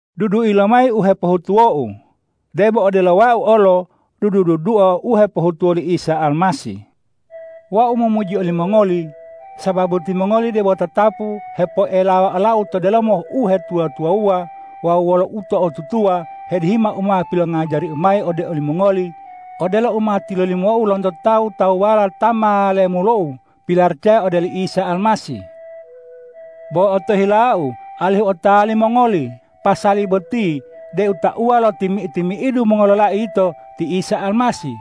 Dudui lomayi u hepohutuwou debo odelo wau olo dudu-dudua u hepohutuwo li Isa Almasih. Wau momuji olimongoli, sababu timongoli debo tatapu hepoelawa olau to delomo uhetuwa-tuwawuwa wawu wolo uto'otutuwa hedihima u ma pilongajariu mayi ode olimongoli odelo u ma tilolimou lonto tawu-tawuwala ta ma lemulou pilaracaya ode oli Isa Almasih. Bo otohilau alihu otawa limongoli pasali boti deu tauwa lo timi-timi'idu mongololai yito ti Isa Almasih,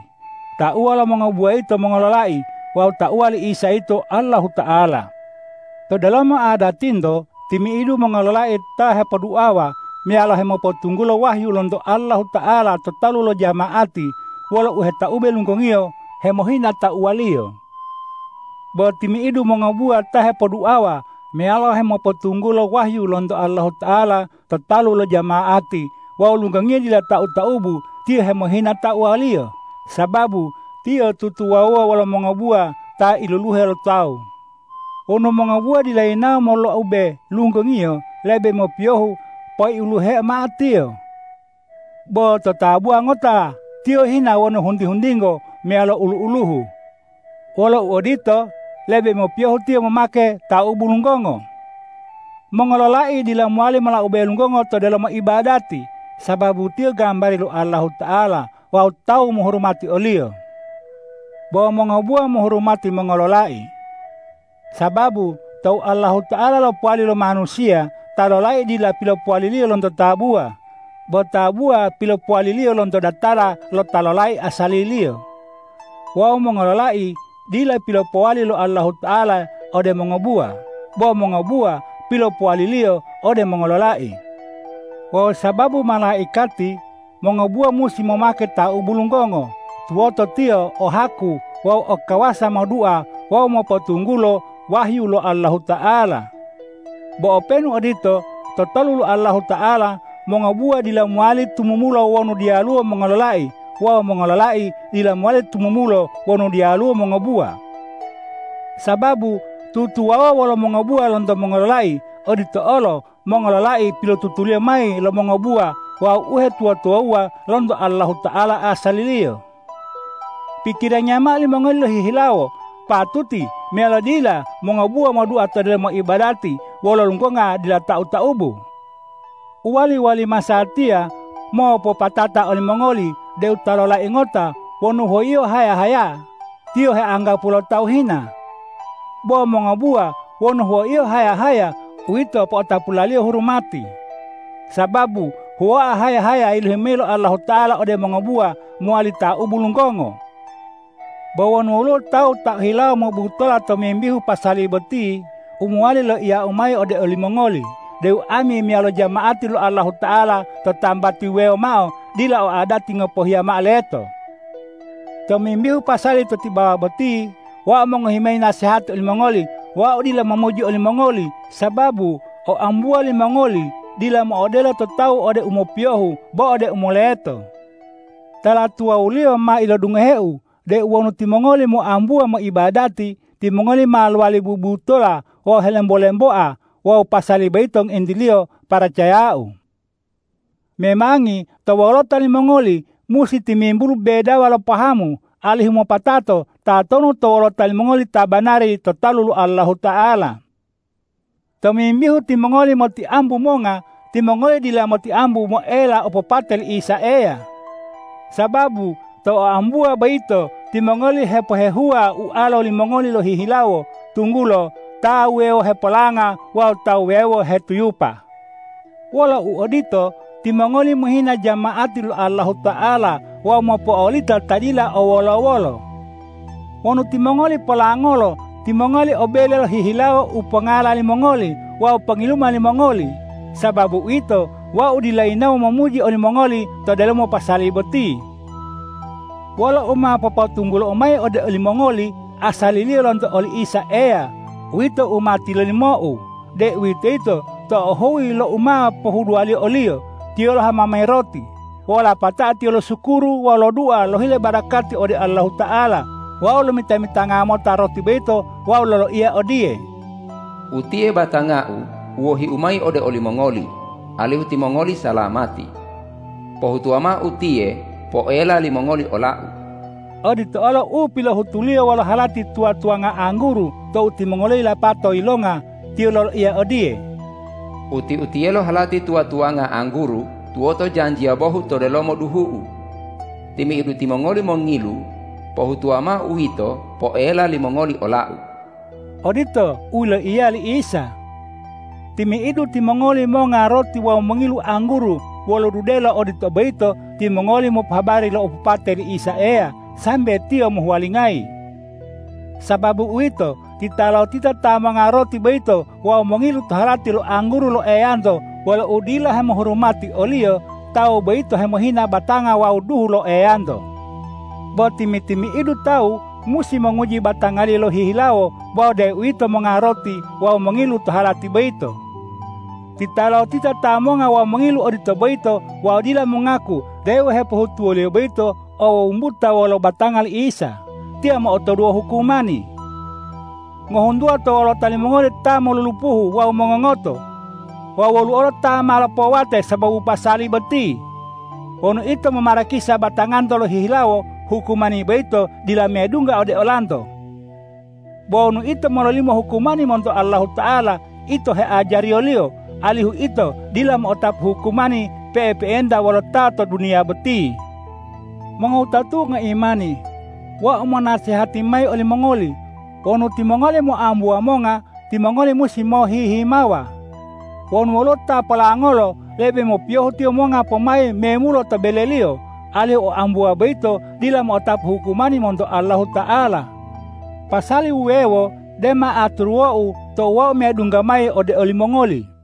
tauwa lo mongobuwa yito mongololai wawu tauwa li Isa yito Allahuta'ala. To delomo adatinto timi'idu mongololai ta hepoduawa meyalo hemopotunggulo wahyu lonto Allahuta'ala to talu lo jama'ati wolo uhetaube lunggongiyo hemohina tauwaliyo. Bo timi'idu mongobuwa ta hepoduawa meyalo hemopotunggulo wahyu lonto Allahuta'ala to talu lo jama'ati wawu lunggongiyo dila tau-taubu, tiyo hemohina tauwaliyo, sababu tiyo tutuwawuwa wolo mongobuwa ta iluluhe lo tawu. Wonu mongobuwa dila yinawo molaube lunggongiyo, lebe mopiyohu poiuluhe mao tiyo. Bo to tabuwa ngota tiyo hina wonu hunti-huntingo meyalo ulu-uluhu. Wolo uodito, lebe mopiyohu tiyo momake taubu lunggongo. Mongololai dila mowali molaube lunggongo to delomo ibadati, sababu tiyo gambari lo Allahuta'ala wawu ta mohurumati o-Liyo. Bo mongobuwa mohurumati mongololai. Sababu tou Allahuta'ala lopowali lo manusiya, ta lolai dila pilopowali-Liyo lonto tabuwa, bo tabuwa pilopowali-Liyo lonto datala lo ta lolai asaliliyo. Wawu mongololai dila pilopowali lo Allahuta'ala ode mongobuwa, bo mongobuwa pilopowali-Liyo ode mongololai. Wawu sababu malaikati, mongobuwa musi momake taubu lunggongo, tuwoto tiyo o haku wawu o kawasa modua wawu mopotunggulo wahyu lo Allahuta'ala. Bo openu odito, to talu lo Allahuta'ala mongobuwa dila mowali tumumulo wonu diyaluwo mongololai wawu mongololai dila mowali tumumulo wonu diyaluwo mongobuwa. Sababu tutuwawuwa wolo mongobuwa lonto mongololai; odito olo mongololai pilotutuliyo mayi lo mongobuwa wawu uhetuwa-tuwawuwa lonto Allahuta'ala asaliliyo. Pikirangiya mao limongoli lohihilawo, patuti meyalo dila mongobuwa modua to delomo ibadati wolo lunggonga dila tau-taubu? U wali-wali masatiya mopatata olimongoli deu ta lolai ngota wonu huwoiyo haya-haya, tiyo heanggapuwo lo tawu hina. Bo mongobuwa wonu huwoiyo haya-haya, uwito po'otapulaliyo hurumati, sababu huwoa haya-haya yilohi mao lo Allahuta'ala ode mongobuwa mowali taubu lunggongo. Bo wonu woluwo tawu ta ohilawo mobutola tomimbihu pasali boti, u mowali loiyau mayi ode olimongoli deu ami meyalo jama'ati lo Allahuta'ala to tambati wuwewo mao dila o adati ngopohiya mao leto. Tomimbihu pasali to tibawa boti, wau mongohi mayi nasehati olimongoli. Wau dila momuji olimongoli, sababu oambuwa limongoli dila mo'odelo to tawu ode u mopiyohu bo ode u moleto. Tala tuwawuliyo ma ilodungoheu deu wonu timongoli moambuwa moibadati, timongoli ma lowali bubutola wawu helembo-lemboa wawu pasali boyito ngointiliyo paracayau. Memangi to wolota limongoli musi timimbulu bedawa lo pahamu, alihu mopatato tatonu to wolota limongoli ta banari to talu lo Allahuta'ala. Tomimbihu timongoli motiambu monga, timongoli dila motiambu moela opopate li Isa Eya. Sababu to oambuwa boyito timongoli hepohehuwa ualo limongoli lohihilawo, tunggulo ta wuwewo hepolanga wawu ta wuwewo hetuyupa. Wolo uodito, timongoli mohina jama'ati lo Allahuta'ala wawu mopo'olita ta dila o wolo-wolo. Wonu timongoli polangolo, timongoli o bele lohihilawo u pongala limongoli wawu pongiluma limongoli. Sababu uwito, wau dila yinawo momuji olimongoli to delomo pasali boti. Wolo u ma popotunggulou mayi ode olimongoli asaliliyo lonto oli Isa Eya uwito u ma tilolimou, deuwitoyito tou huyi lo u ma pohuduwaliyo o-Liyo, Tiyo lohama mayi roti, wawu lapatao Tiyo losukuru wawu lodua lohile barakati ode Allahuta'ala wawu lomita-mitanga mota roti boyito wawu loloiya odiye,”Utiye batanga-U u wohi-U mayi ode olimongoli, alihu timongoli salamati. Pohutuwa mao utiye poela limongoli ola-U!” Odito olo u pilohutu-Liyo wolo halati tuwa-tuwanga angguru tou timongoliyo yilapatao yilonga. Tiyo loloiya odiye,”Uti-utiyelo halati tuwa-tuwanga angguru tuwoto janjiya bohu to delomo duhu-U. Timi'idu timongoli mongilu pohutuwa mao uwito poela limongoli ola-U!” Odito u yiloiya li Isa. Timi'idu timongoli monga roti wawu mongilu angguru wolo dudelo odito boyito, timongoli mopohabari lo opopate li Isa Eya sambe Tiyo mohuwalingayi. Sababu uwito, titalotita ta monga roti boyito wawu mongilu to halati lo angguru lo Eyanto wolo udila hemohurumati o-Liyo, tawu boyito hemohina batanga wawu duhu lo Eyanto. Bo timi-timi'idu tawu musi monguji batangaliyo lohihilawo wawu deuwito monga roti wawu mongilu to halati boyito. Titalotita ta monga wawu mongilu odito boyito wawu dila mongaku deu u hepohutuwoliyo boyito o wumbuta wolo batanga li Isa, tiyo mo'otoduwo hukumani. Ngohuntuwa to wolota limongoli ta molulupuhu wawu mongongoto; wawu woluwo ta ma lopowate sababu pasali boti. Wonu ito momarakisa batanganto lohihilawo, hukumani boyito dila medungga ode olanto. Bo wonu ito mololimo hukumani monto Allahuta'ala, ito heajariyo-Liyo alihu ito dila mo'otapu hukumani pe'epe'enta wolo ta to duniya boti. Mongowutatu'u ngoimani, wau monasehati mayi olimongoli: Wonu timongoli moambuwa monga, timongoli musi mohi-himawa. Wonu woluwo ta polangolo, lebe mopiyohu tiyo monga pomayi memulo to beleliyo, alihu oambuwa boyito dila mo'otapu hukumani monto Allahuta'ala. Pasali wuwewo dema aturuwou tou wau medungga mayi ode olimongoli.